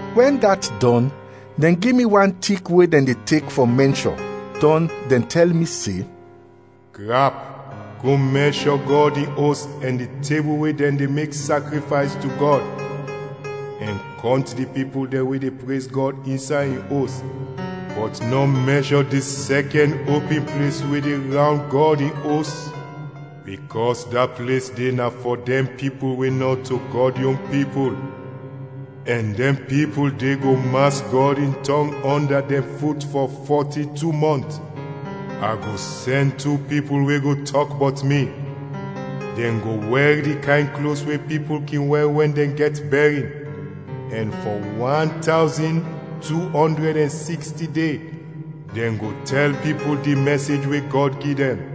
Wɛn dat dɔn, dɛn gi mi wan tik we dɛn de tek fɔ mɛnshɔ, dɔn dɛn tɛl mi se, “Grap, go mɛnshɔ Gɔd in Os ɛn di tebul we dɛn de mek sakrifays to Gɔd, ɛn kɔnt di pipul dɛn we de prez Gɔd insay in Os. Bɔt nɔ mɛnshɔ di sɛkɛn opin ples we de rawnd Gɔd in Os bikɔs da ples de na fɔ dɛn pipul we nɔto Gɔd yon pipul, ɛn dɛn pipul de go mas Gɔd in tɔng ɔnda dɛn fut fɔ fɔti-tu mɔnt. A go sɛn tu pipul we go tɔk bɔt mi, dɛn go wɛr di kayn klos we pipul kin wɛr wɛn dɛn gɛt bɛrin, ɛn fɔ wan tawzin, tu ɔndrɛd ɛn siksti de, dɛn go tɛl pipul di mɛsej we Gɔd gi dɛn.”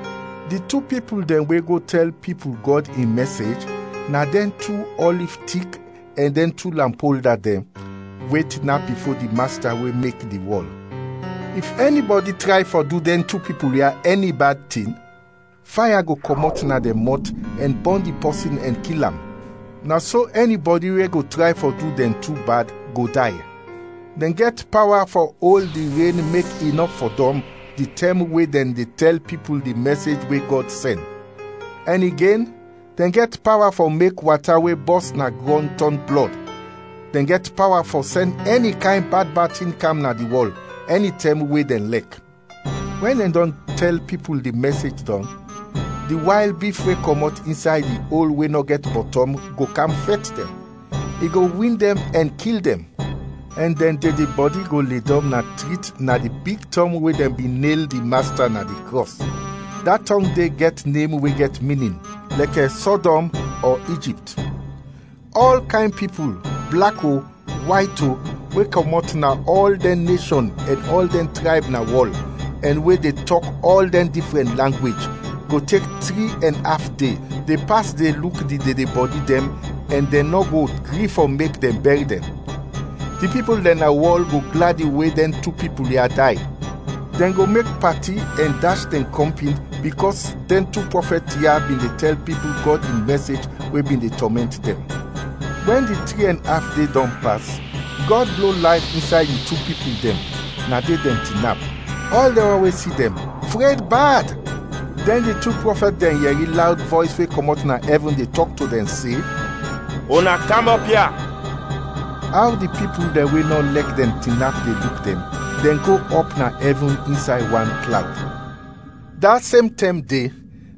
Di tu pipul dɛn we go tɛl pipul Gɔd in mɛsej na dɛn tu ɔliv tik ɛn dɛn tu lampolda dɛn we tinap bifo di Masta we mek di wɔl. If ɛnibɔdi tray fɔ du dɛn tu pipul ya ɛni bad tin, faya go kɔmɔt na dɛn mɔt ɛn bɔn di pɔsin ɛn kil am; na so ɛnibɔdi we go tray fɔ du dɛn tu bad, go day. Dɛn gɛt pawa fɔ ol di ren mek i nɔ fɔdɔm di tɛm we dɛn de tɛl pipul di mɛsej we Gɔd sɛn. Ɛn igen, dɛn gɛt pawa fɔ mek wata we bɔs na grɔn tɔn blɔd; dɛn gɛt pawa fɔ sɛn ɛni kayn bad bad tin kam na di wɔl, ɛnitɛm we dɛn lɛk. Wɛn dɛn dɔn tɛl pipul di mɛsej dɔn, di wayl bif we kɔmɔt insay di ol we nɔ gɛt bɔtɔm go kam fɛt dɛn. I go win dɛn ɛn kil dɛn, ɛn dɛn dedebɔdi go ledɔm na trit na di big tɔng we dɛn bin nel di Masta na di krɔs. Da tɔng de gɛt nem we gɛt minin, lɛkɛ Sɔdɔm ɔ Ijipt. Ɔl kayn pipul, blak o, wayt o, we kɔmɔt na ɔl dɛn neshɔn ɛn ɔl dɛn trayb na wɔl ɛn we de tɔk ɔl dɛn difrɛn langwej go tek tri ɛn af de, de pas de luk di dedebɔdi dɛn, ɛn dɛn nɔ go gri fɔ mek dɛn bɛr dɛn. Di pipul dɛn na wɔl go gladi we dɛn tu pipul ya day. Dɛn go mek pati ɛn dash dɛn kɔmpin bikɔs dɛn tu prɔfɛt ya bin de tɛl pipul Gɔd in mɛsej we bin de tɔmɛnt dɛn. Wɛn di tri ɛn af de dɔn pas, Gɔd blo layf insay di tu pipul dɛn, na de dɛn tinap; ɔl dɛn wan we si dɛn, fred bad. Dɛn di tu prɔfɛt dɛn yɛri lawd vɔys we kɔmɔt na ɛvin de tɔk to dɛn se, “Una kam ɔp ya!” Aw di pipul dɛn we nɔ lɛk dɛn tinap de luk dɛn, dɛn go ɔp na ɛvin insay wan klawd. Da sem tɛm de,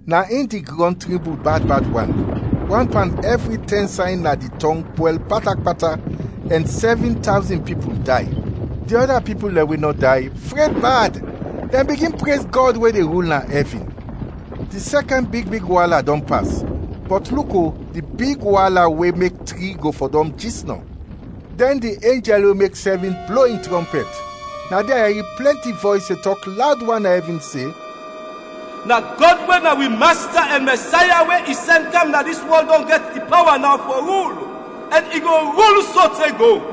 na in di grɔn trimbul bad bad wan; wan pan ɛvri tɛn say na di tɔng pwɛl pata pata, ɛn sɛvin tawzin pipul day. Di ɔda pipul dɛn we nɔ day, fred bad; dɛn bigin prez Gɔd we de rul na ɛvin. Di sɛkɛn big big waala dɔn pas; bɔt luk o, di big waala we mek tri go fɔdɔm jisnɔ. Dɛn di enjɛl we mek sɛvin blo in trɔmpɛt. Na de a yɛri plɛnti vɔys de tɔk lawd wan na ɛvin se, “Na Gɔd we na wi Masta ɛn Mɛsaya we i sɛn kam na dis wɔl dɔn gɛt di pawa naw fɔ rul, ɛn i go rul sote go!”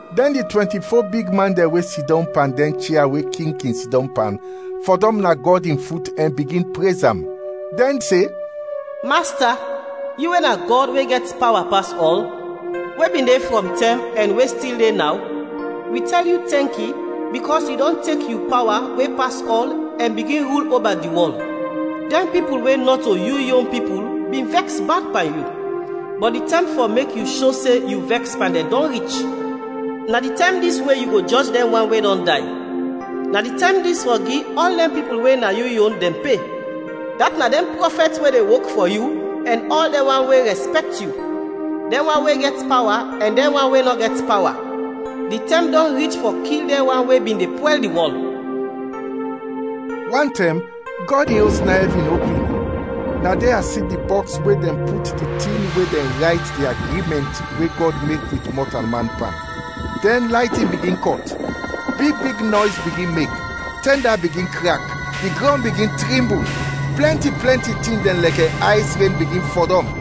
Dɛn di twɛnti-fo bigman dɛn we sidɔm pan dɛn chia we king kin sidɔm pan, fɔdɔm na Gɔd in fut ɛn bigin prez am. Dɛn se, “Masta, yu we na Gɔd, we gɛt pawa pas ɔl, we bin de frɔm tɛm, ɛn we stil de naw! Wi tɛl yu tɛnki bikɔs yu dɔn tek yu pawa we pas ɔl ɛn bigin rul oba di wɔl! Dɛn pipul we nɔto yu yon pipul bin vɛks bad pan yu, bɔt di tɛm fɔ mek yu sho se yu vɛks pan dɛn, dɔn rich; na di tɛm dis we yu go jɔj dɛn wan we dɔn day. Na di tɛm dis fɔ gi ɔl dɛn pipul we na yu yon dɛn pe, dat na dɛn prɔfɛt we de wok fɔ yu ɛn ɔl dɛn wan we rɛspɛkt yu, dɛn wan we gɛt pawa ɛn dɛn wan we nɔ gɛt pawa. Di tɛm dɔn rich fɔ kil dɛn wan we bin de pwɛl di wɔl!” Wantɛm Gɔd in Os na ɛvin opin, na de a si di bɔks we dɛn put di tin we dɛn rayt di agrimɛnt we Gɔd mek wit mɔtalman pan. Dɛn laytin bigin kɔt, big big nɔys bigin mek, tɛnda bigin krak, di grɔn bigin trimbul, plɛnti plɛnti tin dɛn lɛkɛ ays ren bigin fɔdɔm.